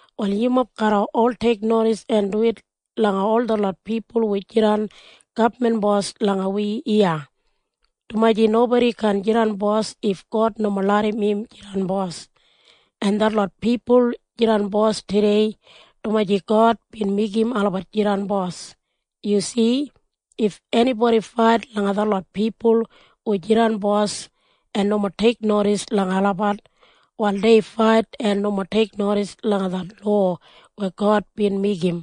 Wal yumob garra ol teiknodis en duwit langa ol detlot pipul hu jidan gabman bos langa wi iya, dumaji nobodi kaan jidan bos if God nomo larram im jidan bos. En detlot pipul jidan bos tudei dumaji God bin meigim olabat jidan bos. Yu si? If enibodi fait langa detlot pipul hu jidan bos en nomo teiknodis langa olabat, wal dei fait en nomo teiknodis langa det lowa weya God bin meigim.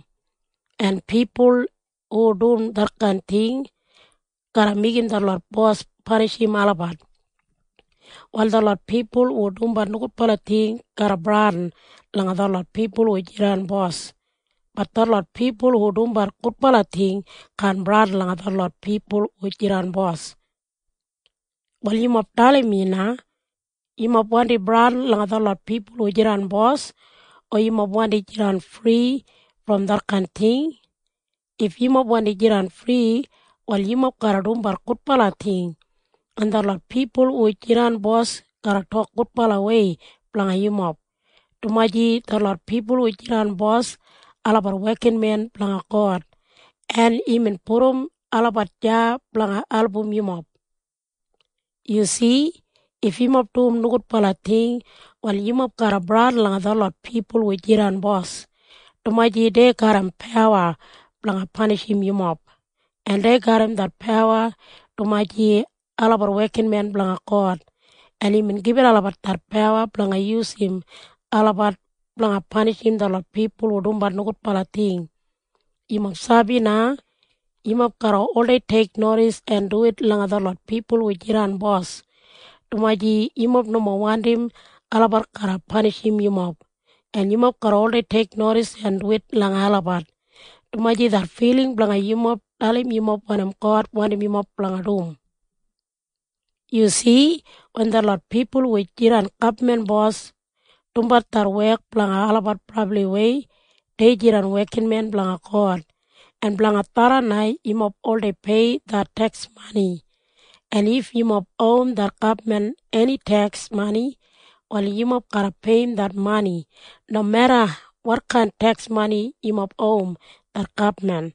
En pipul hu dum detkain ting garra meigim detlot bos panishim olabat. Wal detlot pipul hu dumbat nogudbala ting garra bradin langa detlot pipul hu jidan bos. Bat detlot pipul hu dumbat gudbala ting kaan bradin langa detlot pipul hu jidan bos. Wal yumob dalim mi na. Yumob wandi bradin langa detlot pipul hu jidan bos o yumob wandi jidan fri brom detkain ting? If yumob wandi jidan fri, wal yumob garra dumbat gudbala ting, en detlot pipul hu jidan bos garra tok gudbalawei blanga yumob, dumaji detlot pipul hu jidan bos, olabat wekinmen blanga God, en imbin pudum olabat deya blanga album yumob. Yu si? If yumob dum nogudbala ting, wal yumob garra bradin langa detlot pipul hu jidan bos, dumaji dei garram pawa blanga panishim yumob. En dei garram det pawa dumaji olabat wekinmen blanga God, en imbin gibit olabat det pawa blanga yusum olabat blanga panishim detlot pipul hu dumbat nogudbala ting. Yumob sabi na? Yumob garra oldei teiknodis en duwit langa detlot pipul hu jidan bos, dumaji yumob nomo wandim olabat garra panishim yumob. En yumob garra oldei teiknodis en duwit langa olabat, dumaji det filing blanga yumob dalim yumob wanim God wandim yumob blanga dum. Yu si? Wen detlot pipul hu jidan gabman bos dumbat det wek blanga olabat brabliwei, dei jidan wekinmen blanga God. En blanga tharran na yumob oldei pei det teks mani. En if yumob owim det gabman eni teks mani, wal yumob garra peiyim det mani. Nomeda wotkain teks mani yumob owim det gabman,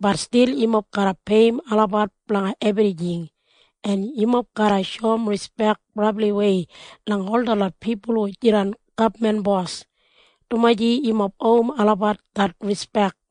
bat stil yumob garra peiyim olabat blanga ebrijing. En yumob garra shoum rispek brabliwei langa ol detlot pipul hu jidan gabman bos, dumaji yumob owim olabat det rispek.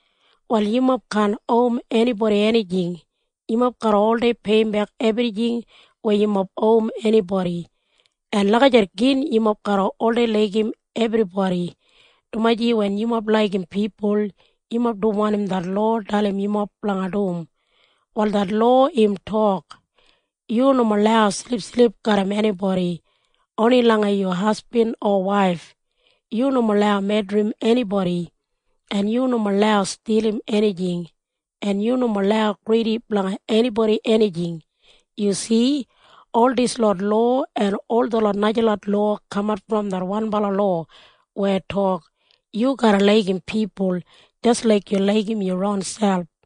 Wal yumob kaan owim enibodi enijing. Yumob garra oldei peiyimbek ebrijing weya yumob owim enibodi. En lagijat gin yumob garra oldei laigim ebribodi, dumaji wen yumob laigim pipul, yumob dum wanim det lowa dalim yumob blanga dum. Wal det lowa im tok, “Yu nomo lau silipsilip garram enibodi. Oni langa yu hasbin o waif. Yu nomo lau medrim enibodi. En yu nomo lau stilim enijing. En yu nomo lau gridi blanga enibodi enijing.” Yu si? Ol dislot lowa en ol detlot najalot lowa kamat brom det wanbala lowa weya tok, “Yu garra laigim pipul jis laik yu laigim yu ronselp.”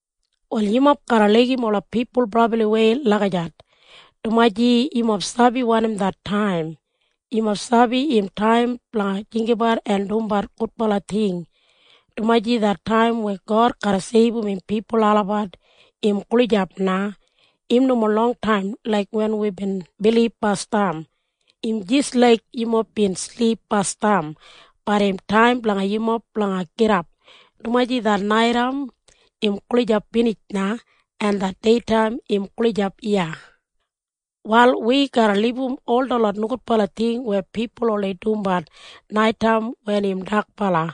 Wal yumob garra laigim ola pipul brabliwei lagijat, dumaji yumob sabi wanim det taim. Yumob sabi im taim blanga jinggabat en dumbat gudbala ting, dumaji det taim weya God garra seibum im pipul olabat im gulijap na. Im nomo longtaim laik wen wibin bilib basdam. Im jis laik yumob bin silip basdam, bat im taim blanga yumob blanga gidap, dumaji det naitaim im gulijap binij na, en det deitaim im gulijap iya. Wal wi garra libum ol detlot nogudbala ting weya pipul oldei dumbat naitaim wen im dakbala,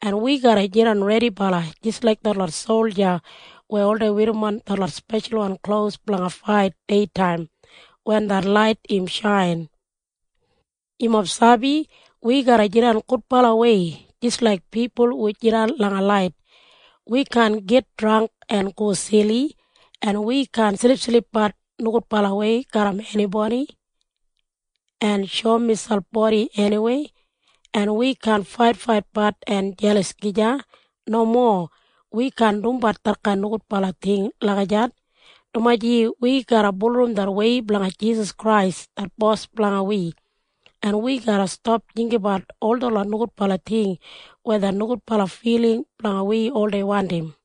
en wi garra jidan redibala jis laik detlot solja weya oldei werrimon detlot speshalwan klos blanga fait deitaim wen det lait im shain. Yumob sabi? Wi garra jidan gudbalawei jis laik pipul hu jidan langa lait. Wi kaan git drangk en go sili, en wi kaan silipsilipbat nogudbalawei garram enibodi en shoum miselp bodi eniweya, en wi kaan faitfaitbat en jelas gija. Nomo. Wi kaan dumbat detkain nogudbala ting lagijat, dumaji wi garra bulurrum det wei blanga Jisas Krais det Bos blanga wi, en wi garra stap jinggabat ol detlot nogudbala ting weya det nogudbala filing blanga wi oldei wandim.